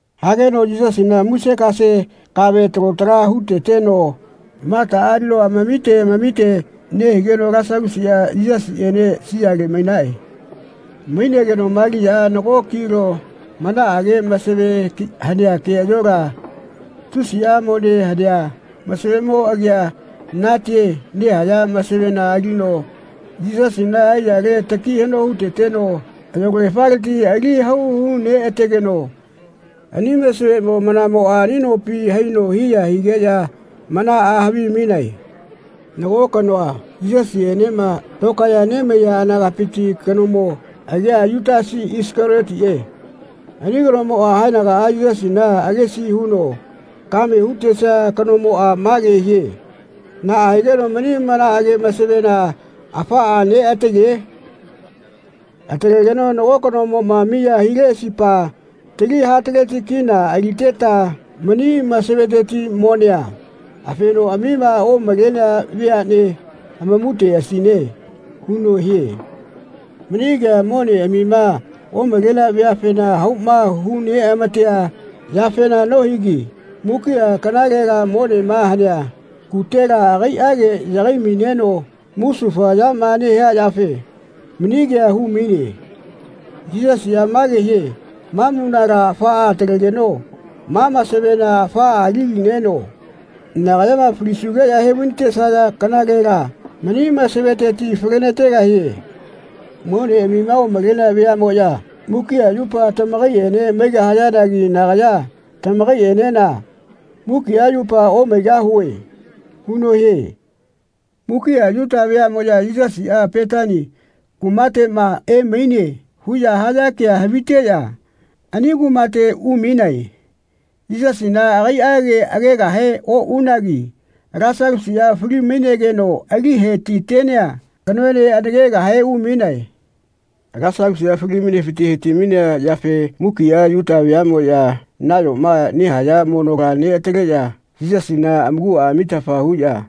Hageno Yisasina musekase kave talo tala hu-teteno Mataꞌa alino amamite amamite nehigeno Lasalusiꞌa Yisasiꞌene siale mainae. Mainageno Maliaꞌa nago kilo manaꞌage masave hanea keꞌayola, tusiꞌa mone hanea masavemo agia natie nehaya masavena alino Yisasina aiyale taki haꞌno hu-teteno ayolagefaleti ali hau hu-neꞌa-tegeno ani masavemo manamoꞌa ani nopi haino hiya higeꞌya manaꞌa havimainae. Nago kanoa, Yisasiꞌenema tokaeꞌya nemaiya anagapiti kanomo, agia Yutasi Isakaliotiꞌe. Ani kanomoꞌa haenagaꞌa Yisasina agesi huno kame ya hu-tesia kanomoꞌa mage hie “Naꞌa higeno mani manaꞌage masavena afaꞌa neꞌatale? Atalegeno nago kanomoꞌma miya hileꞌasipa tali hataleti (K300) kina aliteta mani masaveteti monea afenoꞌamima omalenea veaꞌne amamuteꞌasine.” huno hie. Mani kea moneꞌamima omalenea veafena hauma hu-neꞌa-matea yafena nohigi mukiꞌa kanalela monema hanea kutela agaiꞌa yagai-maineno musufa yama nehia yafe mani kea hu-maine. Yisasiꞌa mage hie “Ma munala afaꞌa atalegeno ma masavena afaꞌa ali-lineno nagayama falisugeꞌya he-vai-natesaya kanalela mani masaveteti fale-na-tegahie. Moneꞌamima omalenea veaꞌmoꞌya mukiꞌa yupa tamakaiꞌene maigahayanagi nagaya tamaikaiꞌenena mukiꞌa yupa omaigahue.” huno hie. Mukiꞌa Yuta veaꞌmoꞌya “Yisasiꞌa Petani kumateꞌma emaine.” huꞌya haya kea haviteꞌya ani kumate umainae. Yisasina agaiꞌage agegahe oꞌunagi Lasalusiꞌa fali-mainegeno ali he-ti-tenea kanoene anakegahe umainae. Lasalusiꞌa fali-mainefiti he-ti-mainea yafe mukiꞌa Yuta veaꞌmoꞌya nayoma nehaya monola neꞌataleꞌya Yisasina amakuꞌa amitafa huꞌya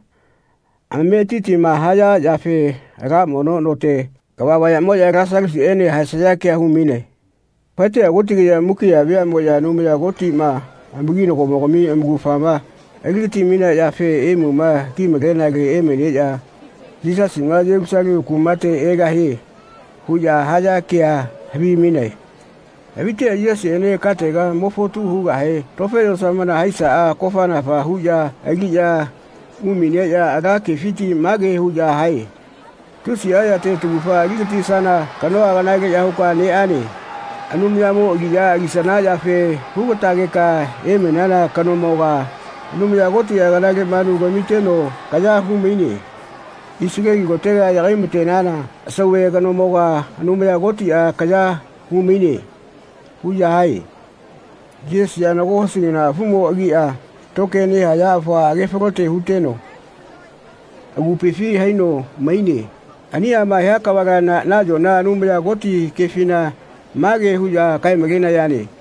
amametitima haya yafe ala mono note kava vayaꞌmoꞌya Lasalusiꞌene haesaya kea hu-mainae. Faeteꞌya kotigeꞌya mukiꞌa veaꞌmoꞌya Anumaya Kotiꞌma amakinagomogami amaugafama ali-gati-mainea yafe imuma ki-malenale emaineꞌya “Yisasiꞌma Yelusalemu kumate egahie.” huꞌya haya kea havi-mainae. Haviteꞌya Yisasiꞌene katega mo fotu hugahe tofe yosamona haisaꞌa kofa-nafa huꞌya aliꞌya umaineꞌya ala kefiti mage huꞌya hae “Tusiꞌa yate taugafa ali-gatisana kanoa kanaleꞌya huka neꞌane. Anumayamo aliꞌya alisana yafe hu-ga-tegeka emainana kanomoga Anumaya Kotiꞌa kanale manu kamiteno kaya hu-maine. Isaleli kotega yagai-ma-tenana sauve kanomoga Anumaya Kotiꞌa kaya hu-maine.” huꞌya hae. Yisasiꞌa nago hosi kana afumo agia tokie nehaya afua age falote huteno agupifi haino maine. Aniꞌama hia kavala nayona Anumaya Koti kefina mage huꞌya kae-malenayane.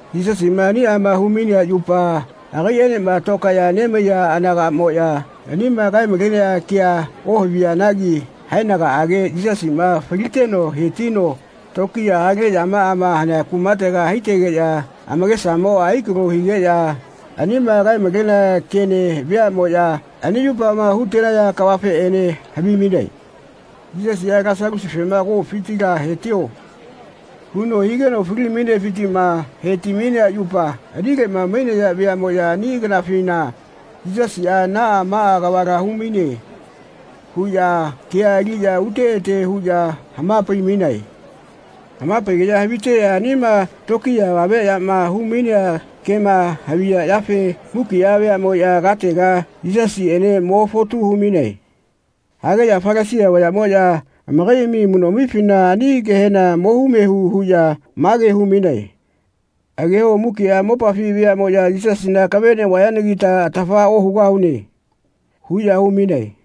Yisasiꞌma aniꞌama hu-mainea yupa agaiꞌenema tokaeꞌya nemaiya anagaꞌmoꞌya anima kae-malenea kea ohavianagi haenagaꞌage Yisasiꞌma faliteno he-tino tokiya hale yamaꞌama hanea kumate haitegeꞌya amakesamoꞌa ai-kalo higeꞌya anima kae-malenea kene veaꞌmoꞌya ani yupama hu-tenaya kavafeꞌene havi-mainae. Yisasiꞌa Lasalusifema “Komufitila he-tio.” huno higeno fali-mainefitiꞌma he-ti-mainea yupa anileꞌma mainaya veaꞌmoꞌya ani kanafina “Yisasiꞌa naꞌa maꞌa kavala hu-maine.” huꞌya kea aliꞌya ute ete huꞌya hama-pai-mainae. Hama-paigeꞌya haviteꞌya anima tokiya avame yama hu-mainea kema haviya yafe mukiꞌa veaꞌmoꞌya katega Yisasiꞌene mo fotu hu-mainae. Hageꞌya Falasia vayaꞌmoꞌya amakaiꞌami amuꞌnoꞌamifina ani kehena mohu mehu huꞌya mage hu-mainae “Ageho mukiꞌa mopafi veaꞌmoꞌya Yisasina akave neꞌvayanagita atafa ohugahune.” huꞌya hu-mainae.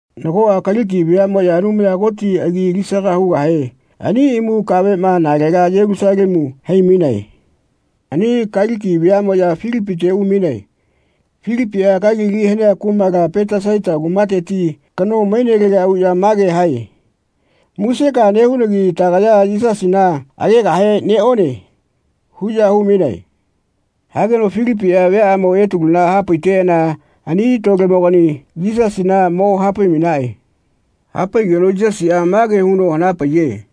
Nagoꞌa Kaliki veaꞌmoꞌya, Anumaya Koti agi alisaga hugahe, ani imu kaveꞌma nalega Yelusalemu hai-mainae. Ani Kaliki veaꞌmoꞌya Filipite umainae. Filipiꞌa Kalili hanea kumala Petesaita kumateti kano mainelega uꞌya mage hae “Musekaꞌa nehunagi tagaya Yisasina agegahe neꞌone.” huꞌya hu-mainae. Hageno Filipiꞌa viaꞌyamo Etaluna hapaiteꞌana ani lolemogani Yisasina mo hapai-mainaꞌe. Hapaiꞌageno Yisasiꞌa mage huno hana-paiye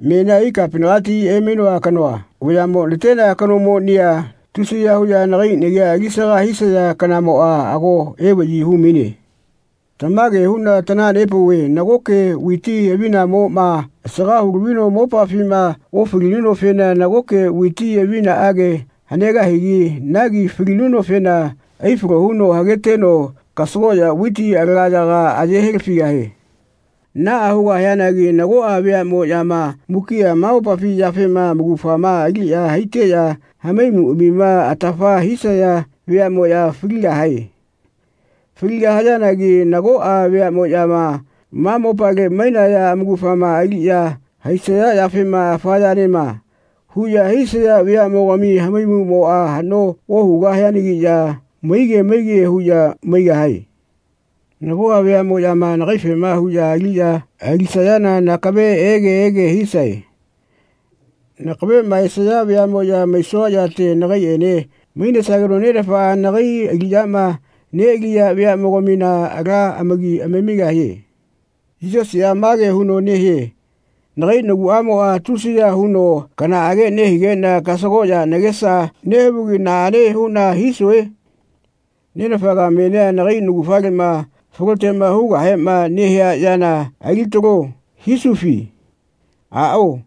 “Menia Ikapinagati emainoa kanoa vayaꞌmo natenea kanomonia tusiya huꞌya nagai nagia ali-saga hisaya kanamoꞌa ago evaꞌyi hu-maine. Tamage huꞌna tanaha-nepauve nagoke viti avinamoꞌma asaga hu-lavino mopafima ofalinunofena nagoke viti avinaꞌage hanegahigi nagi falinunofena ai-falo huno hageteno kasagoꞌya viti alagayaga aye helafigahie. Naꞌa hugahianagi nagoꞌa veaꞌmoꞌyama mukiꞌa ma mopafi yafema amaugafama aliꞌya haiteꞌya hamaimuꞌamima atafa hisaya veaꞌmoꞌya faligahae. Faligahayanagi nagoꞌa veaꞌmoꞌyama ma mopale mainaya amaugafama aliꞌya haisaya yafema ‘Afa yanema.’ huꞌya hisaya veaꞌmogami hamaimuꞌmoꞌa haꞌno ohugahianagiꞌya maige maige huꞌya maigahae. Nagoꞌa veaꞌmoꞌyama nagaifema huꞌya aliꞌya alisayana nakave ege ege hisae. Nakaveꞌma esaya veaꞌmoꞌya maisua yate nagaiꞌene mainesageno Nenafaꞌa nagai aliꞌyama neꞌaliya veaꞌmogamina ala amaki amamigahie.” Yisasiꞌa mage huno nehie “Nagai naguꞌamoꞌa tusiya huno kanaꞌage nehigeꞌna kasagoꞌya nagesa nehavugi naꞌane huꞌna hisue? ‘Nenafaga menia nagai naugafaleꞌma faloteꞌma hugahema nehia yana ali-talo.’ hisufi? Aꞌao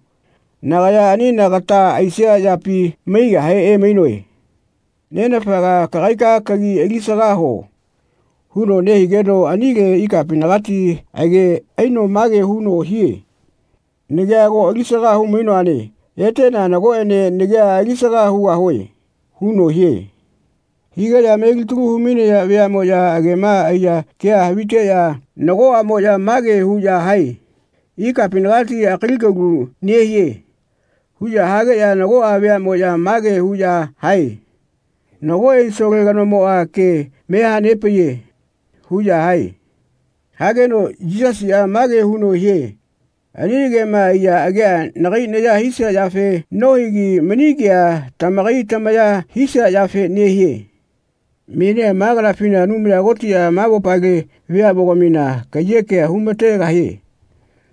nagaya ani nagata aisia yapi maigahe emainoe. Nenafaga kagaika kagi alisaga huo.” huno nehigeno anile ikapinagati age aino mage huno hie “Nagia ago alis-aga hu-mainoane eteꞌna nagoꞌene nagia ali-saga hugahue.” huno hie. Higeꞌya melitalu hu-mainaya veaꞌmoꞌya agema aiya kea haviteꞌya nagoꞌamoꞌya mage huꞌya hae “Ikapinagati akali kalu nehie.” huꞌya hageꞌya nagoꞌa veaꞌmoꞌya mage huꞌya hae “Nago ensole kanomoꞌa ke me hanepaiye.” huꞌya hae. Hageno Yisasiꞌa mage huno hie “Ani agema aiya agea nagai naya hisia yafe nohigi mani kea tamakai tamaya hisia yafe nehie. Menia ma kanafina Anumaya Kotiꞌa ma mopale veaꞌmogamina kaiyeke hu-ma-tegahie.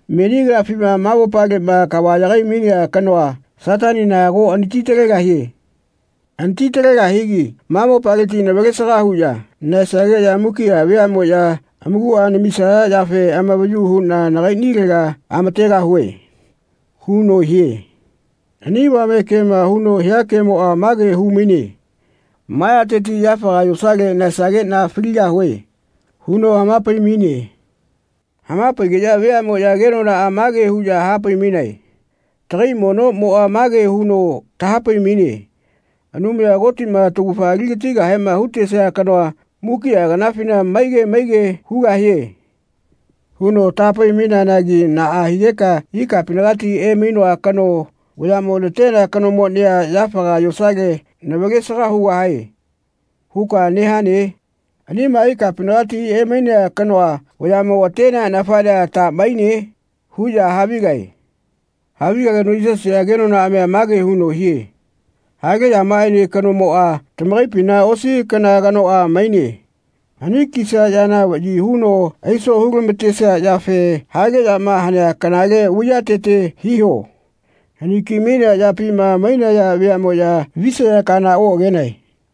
Meni kanafima ma mopaleꞌma kava yagai-mainea kanoa, Satanina ago anati-talegahie. Anati-talegahigi ma mopaleti navalesaga huꞌya nahaesageꞌya mukiꞌa veaꞌmoꞌya amakuꞌa namisaya yafe amavayu huꞌna nagaiꞌnilega amategahue.” huno hie. Ani avame kema huno hia kemoꞌa mage hu-maine “Ma yateti, yafaga yosale nahaesageꞌna faligahue.” huno hama-pai-maine. Hama-paigeꞌya veaꞌmoꞌya kenonaꞌa mage huꞌya hapai-mainae “Tagai monoꞌmoꞌa mage huno taha-pai-maine ‘Anumaya Kotiꞌma taugafa ali-gatigahema hu-tesia kanoa mukiꞌa kanafina maige maige hugahie.’ huno taha-pai-maineanagi naꞌa higeka ‘Ikapinagati emainoa kanoa vayaꞌmo natenea kanomonia yafaga yosale navalesaga hugahae.’ huka nehane? Anima ikapinagati emainea kanoa vayaꞌmo atenea nafaꞌnea ta maine?” huꞌya havigae. Havigageno Yisasiꞌa kenonaꞌamia mage huno hie “Hale yamaꞌaene kanomoꞌa tamakaipina osi kana kanoꞌa maine. Hani kisia yana vaꞌyi huno aiso hu-lama-tesia yafe hale yama hanea kanale vaiyatete hiho. Hani-ki-mainea yapima mainaya veaꞌmoꞌya visaya kana oꞌagenae.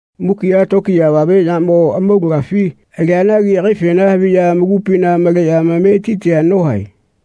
Mukiꞌa tokiya avameꞌyamo amaulagafi alianagi agaifena haviꞌya amakupina maleꞌya amametitia nohae.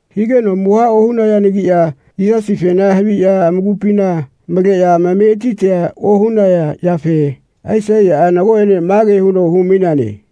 Higeno amuha ohunayanagiꞌya Yisasifena haviꞌya amakupina maleꞌya amametitia ohunaya yafe Aisaiyaꞌa nagoꞌene mage huno humaineane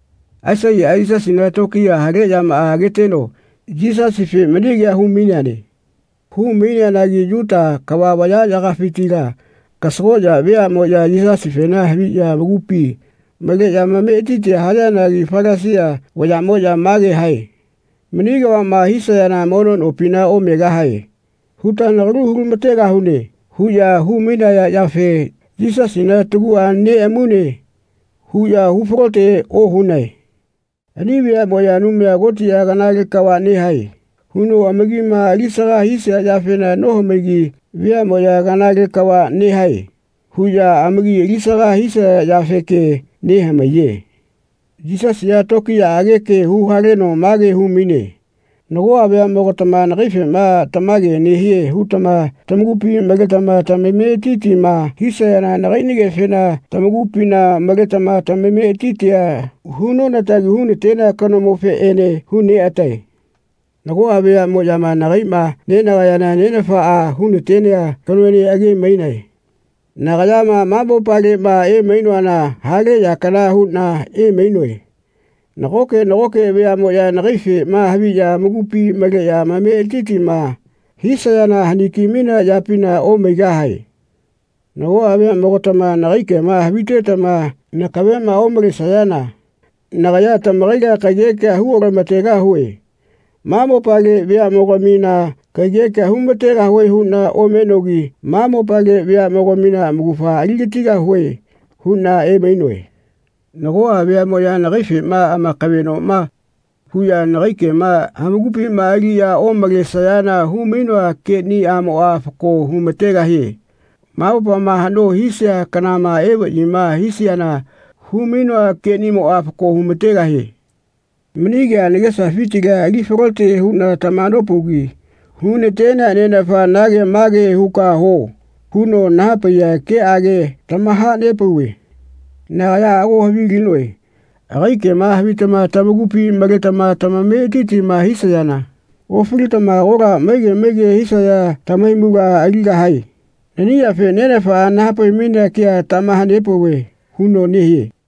Aisaiyaꞌa Yisasina tokiya hale yamaꞌa ageteno Yisasife mani kea hu-maineane. Hu-maineanagi Yuta kava vayaꞌyagafitila kasagoꞌya vayaꞌmoꞌya Yisasife haviꞌya amakupi maleꞌya amametitia hayanagi Falasia vayaꞌmoꞌya mage hae “Mani kavaꞌma hisayana mono nopina omegahae huta nagalu hu-lama-tegahune.” huꞌya hu-mainaya yafe “Yisasina taguꞌa neꞌamune.” huꞌya hu-falote ohunae. Ani veamoꞌya Anumaya Kotiꞌa “Kanale kava nehae.” huno amakima alisaga hisia yafena nohamaigi veaꞌmoꞌya “Kanale kava nehae.” huꞌya amaki alisaga hisaya yafeke nehamaiye. Yisasiꞌa tokiyaꞌage ke hu-haleno mage hu-maine “Nagoꞌa veaꞌmogatama nagaifema tamage nehie hutama tamakupi maletama tamametitima hisayana nagaiꞌnigefena tamakupina maletama tamametitia hu-nona-tagi hu-na-tenea kanomofeꞌene hu-neꞌa-tae. Nagoꞌa veaꞌmoꞌyama nagaiꞌma nenagayana Nenafaꞌa hu-na-tenea kanoene age-mainae. Nagayama ma mopaleꞌma emainoana hale ya kana huꞌna emainoe. Nagoke nagoke veaꞌmoꞌya nagaifeꞌma haviꞌya amakupima maleꞌya amametitima hisayana haniki-mainea yapina omaigahae. Nagoꞌa veaꞌmogatama nagai kema havitetama nakaveꞌma omalesayana nagaya tamakaila kaiyekea hu otama-tegahue. Ma mopale veaꞌmogamina kaiyekea hu-ma-tegahue huꞌna omenogi ma mopale veaꞌmogamina amaugafa ali-gatigahue huꞌna emainoe. Nagoꞌa veaꞌmoꞌya nagaifeꞌma amakaveꞌnoma huꞌya nagai kema amakupima aliꞌya omalesayana hu-mainoa keꞌnimoꞌa fako hu-ma-tegahie. Ma mopama haꞌno hisia kanama evaꞌyima hisiana hu-mainoa keꞌnimoꞌa fako hu-ma-tegahie. Mani kea nagesafitila ali falote huꞌna tamaha-nopaugi hu-na-tenea Nenafa ‘Nage mage huka huo.’ huno naha-paiya keꞌage tamaha-nepauve. Nagaya ago havilinoe agai kema havitama tamakupima maletama tamametitima hisayana ofalitama agola maige maige hisaya tamahaimula aligahae. Nani yafe Nenafaꞌa naha-pai-mainea kea tamaha-nepauve.” huno nehie.